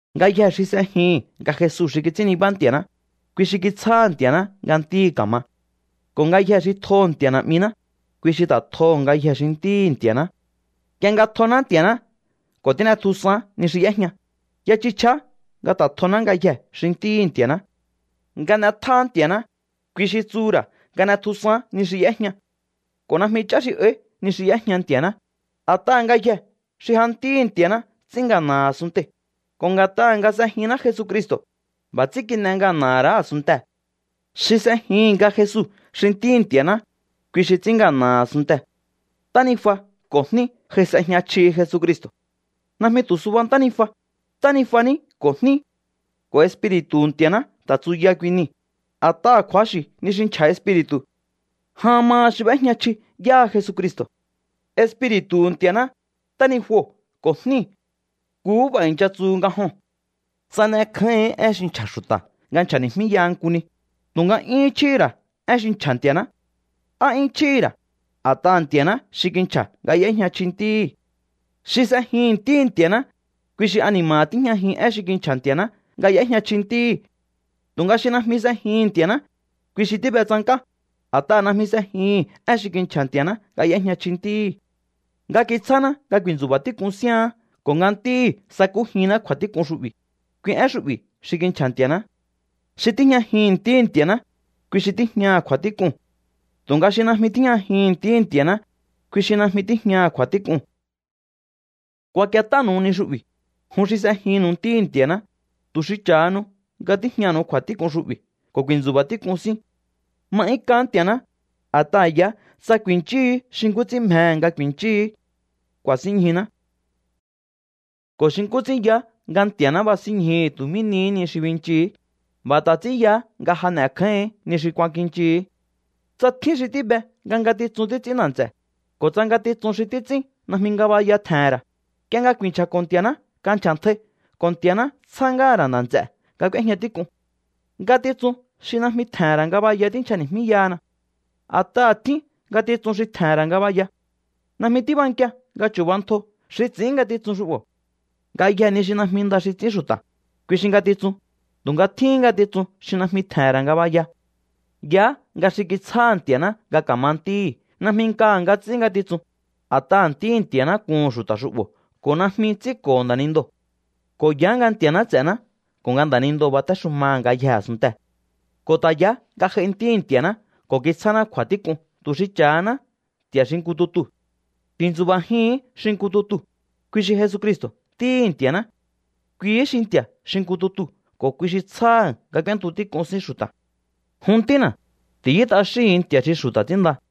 Ngayjee̱ xi s'ejihi̱n nga Jesu xi kits'ín nibá Nti̱a̱ná, kui xi kitsjáha̱ Nti̱a̱ná nga ntíhi̱ ka̱ma. Ko̱ ngayjee̱ xi tjoho̱ Nti̱a̱ Na̱'miná, kui xi ta̱ tjoho̱ ngayjee̱ xi ntíhi̱ Nti̱a̱ná. Nk'ie nga tjoná Nti̱a̱ná ko̱ tín'etjusaán ni xi y'éjña, ya chji chjiá nga ta̱ tjoná ngayjee̱ xi ntíhi̱ Nti̱a̱ná. Nga n'e̱tjáá Nti̱a̱ná, kui xi tsuhu̱ ra̱ nga n'e̱tjusaán ni xi y'éjña. Ko̱ najmi ch'á xi áí ni xi y'éjña Nti̱a̱ná, a̱t'aha̱ ngayjee̱ xi ja ntíhi̱ Nti̱a̱ná ts'ín ngana̱ha̱ a̱sunntei̱. Ko̱ nga̱t'aha̱ nga s'ejinná Jesucristo̱, b'a̱ ts'ín kin'e ngana̱ha̱ ra̱á a̱sunntee̱. Xi s'ejihi̱n nga Jesu xi Ntíhi̱ Nti̱a̱ná, kui xi ts'ín ngana̱ha̱ a̱sunntee̱. Ntánijua ko̱ jní j'ai s'ejña chjihi Jesucristo̱. Najmi tu̱ suba ntánijua, ntánijua ní ko̱ jní. Ko̱ Espiri̱tu̱hu̱ Nti̱a̱ná ta̱ tsuya kui nii̱, a̱t'aha̱ kju̱axi̱ ni xi nchja̱ Espiri̱tu̱. Jan maha xi b'éjña chji yáha Jesucristo̱: Espiri̱tu̱hu̱ Nti̱a̱ná, ntánijuo̱ ko̱ jníu̱. Nkuhú b'a̱ i̱ncha tsu nga joo̱n. Tsa n'ekjáíhi̱ín én xi nchja̱ xu̱ta̱ nga nchja̱ni̱jmíyaha nku ni, tu̱nga yúhún chjíhi̱ ra̱ én xi nchja̱ Nti̱a̱ná. Á 'yún chjíhi̱ ra̱, a̱t'aha̱ Nti̱a̱ná xi kinchja̱ nga y'éjña chji Ntíhi̱. Xi s'ejihi̱n Ntíhi̱ Nti̱a̱ná, kui xi ani̱ma̱ha̱ tíjñajihi̱n én xi kinchja̱ Nti̱a̱ná nga y'éjña chji Ntíhi̱. Tu̱nga xi najmi s'ejihi̱n Nti̱a̱ná, kui xi tíbe tsank'á, a̱t'aha̱ najmi s'ejihi̱n én xi kinchja̱ Nti̱a̱ná nga y'éjña chji Ntíhi̱. Nga kitsjáná nga ku̱i̱ntsu̱ba̱ tík'un síaán ko̱ nga Ntíhi̱ sakújinná kju̱a̱tík'un xu'bi̱, kui én xu'bi̱ xi kinchja̱ Nti̱a̱ná. Xi tíjñajihi̱n Ntíhi̱ Nti̱a̱ná, kui xi tíjñaha̱ kju̱a̱tík'uu̱n. Tu̱nga xi najmi tíjñajihi̱n Ntíhi̱ Nti̱a̱ná, kui xi najmi tíjñaha̱ kju̱a̱tík'uu̱n. Kuak'iet'ánu̱u ni xu'bi̱, jun xi s'ejinnu̱u Ntíhi̱ Nti̱a̱ná, tu̱ xi cha̱hanu nga tíjñanu̱u kju̱a̱tík'un xu'bi̱ ko̱ ku̱i̱ntsu̱ba̱ tík'un síún. Ma'yúnk'aán Nti̱a̱ná, a̱t'aha̱ yaá tsa ku̱i̱nchíhi̱í xi nkú ts'ín mjehe̱ nga ku̱i̱nchíhi̱í, ku̱a̱sínñjuná. Ko̱ xi nkú ts'ín yaá nga Nti̱a̱ná basínñjuhu̱ tu̱ mí nihí ni xi binchihi̱í, b'a̱ ta̱ ts'ín yaá nga ja n'e̱kjáíhi̱ín ni xi kuakinchihi̱í. Tsa tjín xi tíbe nga ngatitsun títs'ín nda̱ nts'e̱, ko̱ tsa ngatitsun xi títs'ín najmi ngabaya tje̱he̱n ra̱, nk'ie nga ku̱i̱nchja̱ko̱ Nti̱a̱ná kanchja̱ntjai ko̱ Nti̱a̱ná tsjá ngáha̱ ra̱ nda̱ nts'e̱ nga k'úéjña tík'un. Ngatitsun xi najmi tje̱he̱n ra̱ ngabaya tínchjani̱jmíyahana. A̱t'aha̱ tjín ngatitsun xi tje̱he̱n ra̱ ngabaya. Najmi tíbankia nga chu̱bantjo xi ts'i̱ín ngatitsun xu'bo̱. Ngayjee̱ ni xi najmi nda xi ts'ín xu̱ta̱, kui xi ngatitsun, tu̱nga tjíhín ngatitsun xi najmi tje̱he̱n ra̱ ngabaya. Yaá nga xi kitsjáha̱ Nti̱a̱ná nga ka̱ma ntíhi̱ najmi nkaha̱ nga ts'ín ngatitsun, a̱t'aha̱ Ntíhi̱ Nti̱a̱ná kuhu̱n xu̱ta̱ xu'bo̱ ko̱ najmi ts'ínko̱ho̱ nda̱nindoo̱. Ko̱ yaá nga Nti̱a̱ná ts'e̱ná ko̱ nga nda̱nindoo̱ batéxumaha̱ ngayjee̱ a̱sunntee̱. Ko̱ ta̱ yaá nga j'ai Ntíhi̱ Nti̱a̱ná ko̱ kitsjáná kju̱a̱nkjintak'un tu̱ xi cha̱haná Nti̱a̱ xi nku tutuu̱. Tintsu̱ba̱jihi̱ín xi nku tutuu̱, kui xi Jesucristo̱ Ntíhi̱ Nti̱a̱ná. Kuihí xi Nti̱a̱ xi nku tutuu̱ ko̱ kui xi tsjáha̱ nga k'úéntu tík'un sín xu̱ta̱. Jun ntína̱, ti̱yú t'axíhu̱un nti̱a̱ xi xu̱ta̱ ts'ínnda.